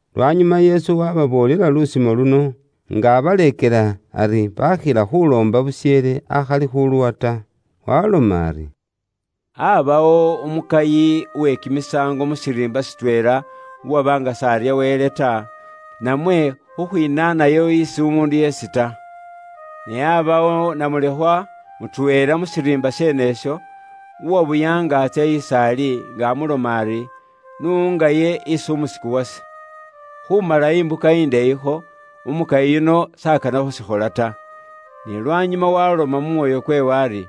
Lwanyuma Yesu waababoolela lusimo luno, nga abaleekela ari, baakhila khuuloomba busheele akhali khuuluwa ta. Waaloma ari, “Aabawo umukayi we kimisaango mu shiriimba shitweela uwaba nga s'arya Wele ta, namwe khukhwinaanayo isi umuundu yeesi ta. Ne aabaawo namulekhwa mutweela mu shiriimba sheene isho, uwabuya nga etsa is'ali, nga amuloma ari, ‘N'ungaye isi umusiku wase.’ “Khuumala imbuka ndeeyikho, umukayi yuno s'akana khuushikhola ta. Ne lwanyuma waaloma mu mwoyo kweewe ari,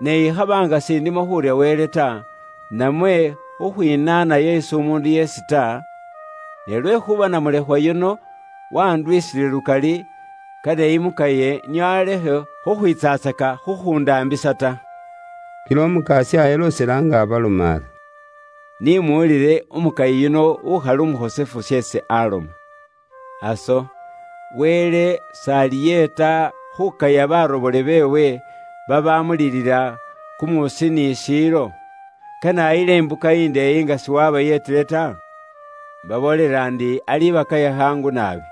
‘Ne ikhaba nga s'indimo khuurya Wele ta, namwe khukhwiinaanayo isi umuundu yeesi ta, ne lwekhuuba namulekhwa yuno wanduwisile lukali, kane imukaye nio alekhe khukhwiitsatsaka khukhundaambisa ta.’” Kila Umukasya eloosela nga abaloma ari, “Ni muwulile umukayi yuno ukhola bye bubwoonaki sheesi aloma. Aso, Wele s'aliyeeta khukaya barobole beewe babamulilila kumuusi ni mu shiilo? Kane ayile imbuka indeeyi nga siwabayeetile ta? Mbaboolela ndi alibakaya khaangu naabi.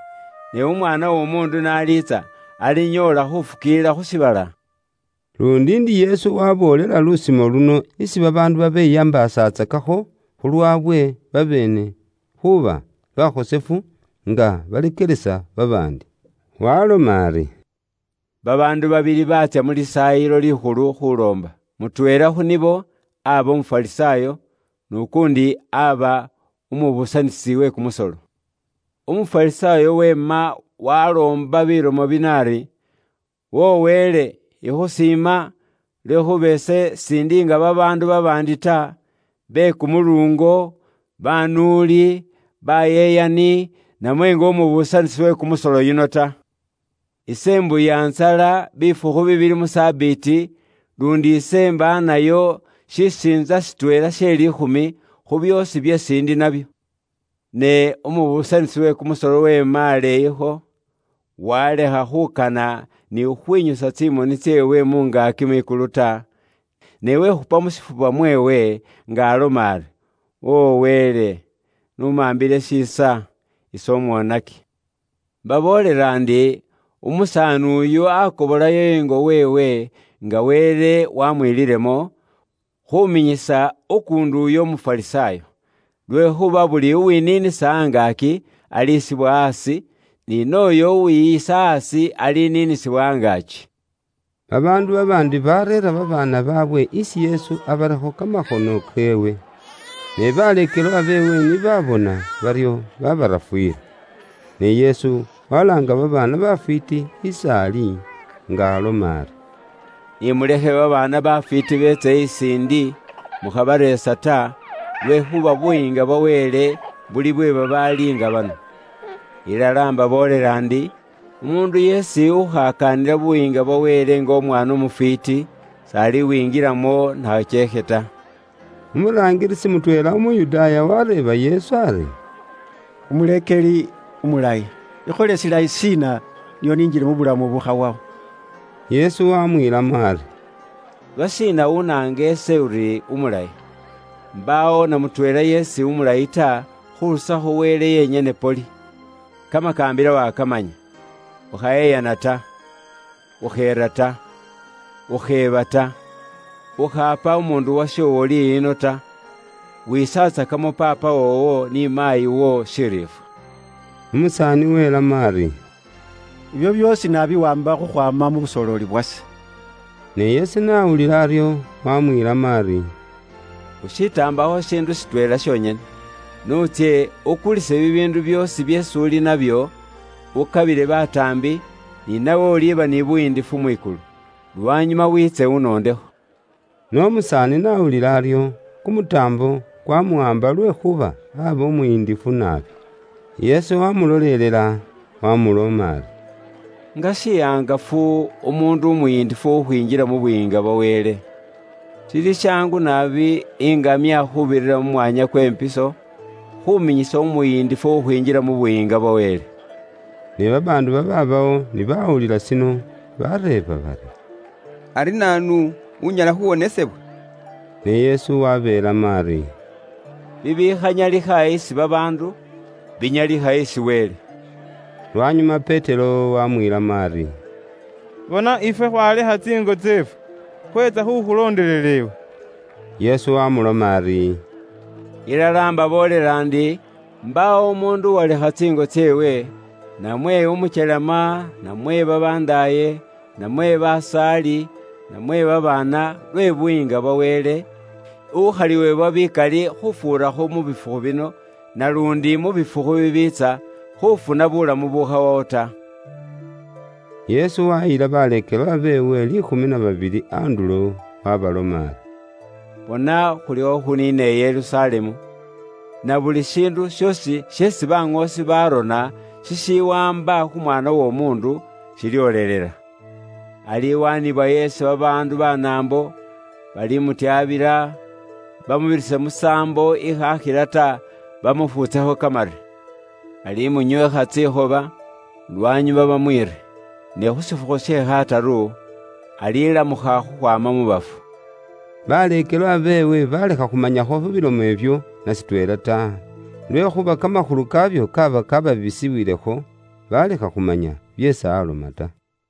Ne Umwaana w'Omuundu n'aliitsa alinyoola khufukiilila khu shiibala?” Luundi ndi Yesu waboolela lusimo luno isi babaandu babeyambaasatsakakho khulwawe babeene khuuba bakhosefu, nga baleekelesa babaandi. Waloma ari, “Babaandu babili baatsya mu Lisaayilo Likhulu khuloomba. Mutweela khu nibo aba Umufarisaayo, n'ukuundi aba umubuusanisi we kumusolo. Umufarisaayo weema waloomba bilomo bino ari, ‘Wo Wele ise ikhusiima iwe, lwekhuuba ise s'indi nga babaandu babaandi ta, babaali banuuli, si bali babeyikinwa ta, bayeyani, namwe nga umubuusanisi we kumusolo yuno ta. Ise Imbuya ntsala bifukhu bibili mu Sabiti, luundi ise imbaanayo shisiintsa shitweela she liikhumi, khu byoosi byeesi ndi nabyo.’ “Ne umubuusanisi we kumusolo weema aleeyikho, walekha khukana ni khukhwinyusa tsimoni tseewe mu ngaaki mwikulu ta, ne wekhupa mu shifuba mweewe, nga aloma ari, ‘Wo Wele, n'umambile shiisa, ise umwonaki.’ “Imbaboolela ndi, umusaani uyu akobolayo ingo weewe nga Wele wamwililemo, khuminyisa ukuundi uyo Umufarisaayo. Lwekhuuba buli uwiniinisa angaaki, alisibwa aasi, ni nooyo uwiyisa aasi, aliniinisibwa angaaki.” Babaandu babaandi bareera babaana baabwe isi Yesu abarekho kamakhono keewe. Ne baleekelwa beewe ni baabona baryo babarafuyila. Ne Yesu walaanga babaana bafwiiti is'ali nga aloma ari, “Ni mulekhe babaana bafwiiti beetse is'indi, mukhabareesa ta, lwekhuuba Buyiinga bwa Wele buli bwe babaali nga bano. Ilala mbaboolela ndi, umuundu yeesi ukhakaanila Buyiinga bwa Wele nga Umwaana umufwiiti, s'alibwingilamo na khakyeekhe ta.” Umuraangilisi mutweela Umuyudaaya wareeba Yesu ari, “Umuleekeli umulayi, ikhole shilayi shiina, nio ninjile mu bulamu bukhawawo?” Yesu wamwiilamo ari, “Lwashiina unaanga ise uri umulayi? Mbaawo na mutweela yeesi umulayi ta, khurusakho Wele yenyene poli. Kamakaambila wakamanya: ‘Ukhayeyana ta, ukheera ta, ukheeba ta, ukhaapa umuundu washoowo liyino ta, wisatsakemo paapawo ni maayiwo shiriifwa.’” Umusaani welamo ari, “Ibyo byoosi naabiwaamba khukhwaama mu busooleli bwase.” Ne Yesu n'awulila aryo wamwiilamo ari, “Ushitaambakho shishiindu shitweela shonyene: n'utsye, ukulise bibiindu byoosi byeesi uli nabyo, ukabile bataambi, ni nawe uliba ni buyiindifu mwikulu. Lwanyuma wiitse unondekho.” Ne umusaani n'awulila aryo, kumutaambo kwamuwaamba lwekhuuba aba umuyindifu naabi. Yesu wamulolelela, wamuloma ari, “Nga shihangafu, umuundu umuyindifu khukhwinjila mu Buyiinga bwa Wele. Shili shaangu naabi iŋamya khuubirira mu mwanya kwe mpiso, khuminyisa umuyindifu khukhwinjila mu Buyiinga bwa Wele.” Ne babaandu babaabawo ni bawulila shino, bareeba bari, “Ari naanu, unyala khuwonesebwa?” Ne Yesu wabeelamo ari, “Bibikhanyalikha isi babaandu, binyalikha isi Wele.” Lwanyuma Petero wamwiilamo ari, “Bona ifwe khwalekha tsiingo tseefwe, khwetsa khukhulondelela iwe.” Yesu wamuloma ari, “Ilala mbaboolela ndi, mbaawo umuundu uwalekha tsiingo tseewe, namwe umukyelema, namwe babandaaye, namwe basaali, namwe babaana, lwe Buyiinga bwa Wele, ukhaliwebwa bikali khufuurakho mu muboolo kuno, naluundi mu muboolo kukwiitsa, khufuna buulamu bukhawawo ta.” Yesu wayila baleekelwa beewe liikhumi na babili andulo, waabaloma ari, “Bona, khulikho khuniina i Yerusalemu, na buli shiindu shoosi sheesi baŋoosi baarona shishiwaamba khu Mwaana w'Omuundu, shilyoolelela. Aliwaanibwayo isi babaandu Banaambo, balimutyabila, bamubirise musaambo ikhaakhila ta, bamufuutsekho kamare. Balimunyweekha tsikhoba, lwanyuma bamwiire. Ne khu shifukhu she khataru, alilamukha khukhwaama mu bafu.” Baleekelwa beewe balekha khumanyakho khu bilomo ibyo na shitweela ta, lwekhuuba kamakhulu kaabyo kaaba kababisiwilekho, balekha khumanya byeesi aloma ta.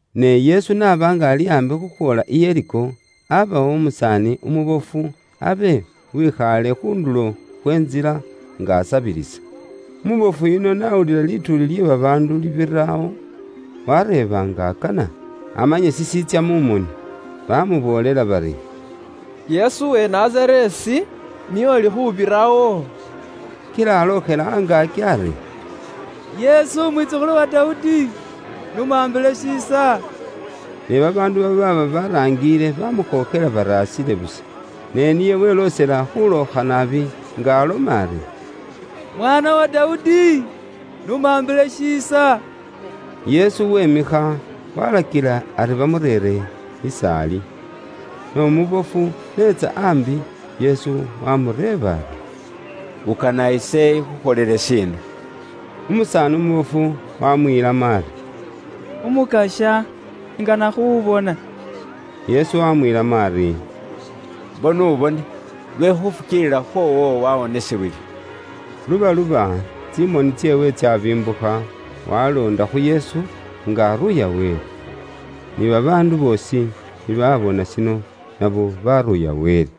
Ne Yesu n'aba nga ali aambi khukhwoola i Yeriko, abaawo umusaani umubofu abe uwikhaale khu ndulo khwe ntsila nga asabilisa. Umubofu yuno n'awulila lituuli lye babaandu libirawo, wareeba nga akana amanye shishiitsya mu moni. Bamuboolela bari, “Yesu uwe Nazareesi, niye uli khubirawo.” Kila alookhela angaaki ari, “Yesu Umwitsukhulu wa Dawudi, n'umambile shiisa.” Ne babaandu babaaba baraangile, bamukhookhela bari asile busa. Ne niye weloosela khulookha naabi nga aloma ari, “Mwaana wa Dawudi! N'umambile shiisa!” Yesu wemikha, walakila ari bamureere is'ali. Ne umubofu n'etsa ambi, Yesu waamureeba ari, “Ukana ise ikhukholele shiina?” Umusaani umubofu wamwiilamo ari, “Umukasya ingana khubona.” Yesu wamwiilamo ari, “Mbo n'ubone, lwe khufukiilila khwoowo wawonesebwile.” Lubaluba, tsimoni tseewe tsabimbukha, waloonda khu Yesu, nga aruuya Wele. Ni babaandu boosi ni babona shino, nabo baruuya Wele.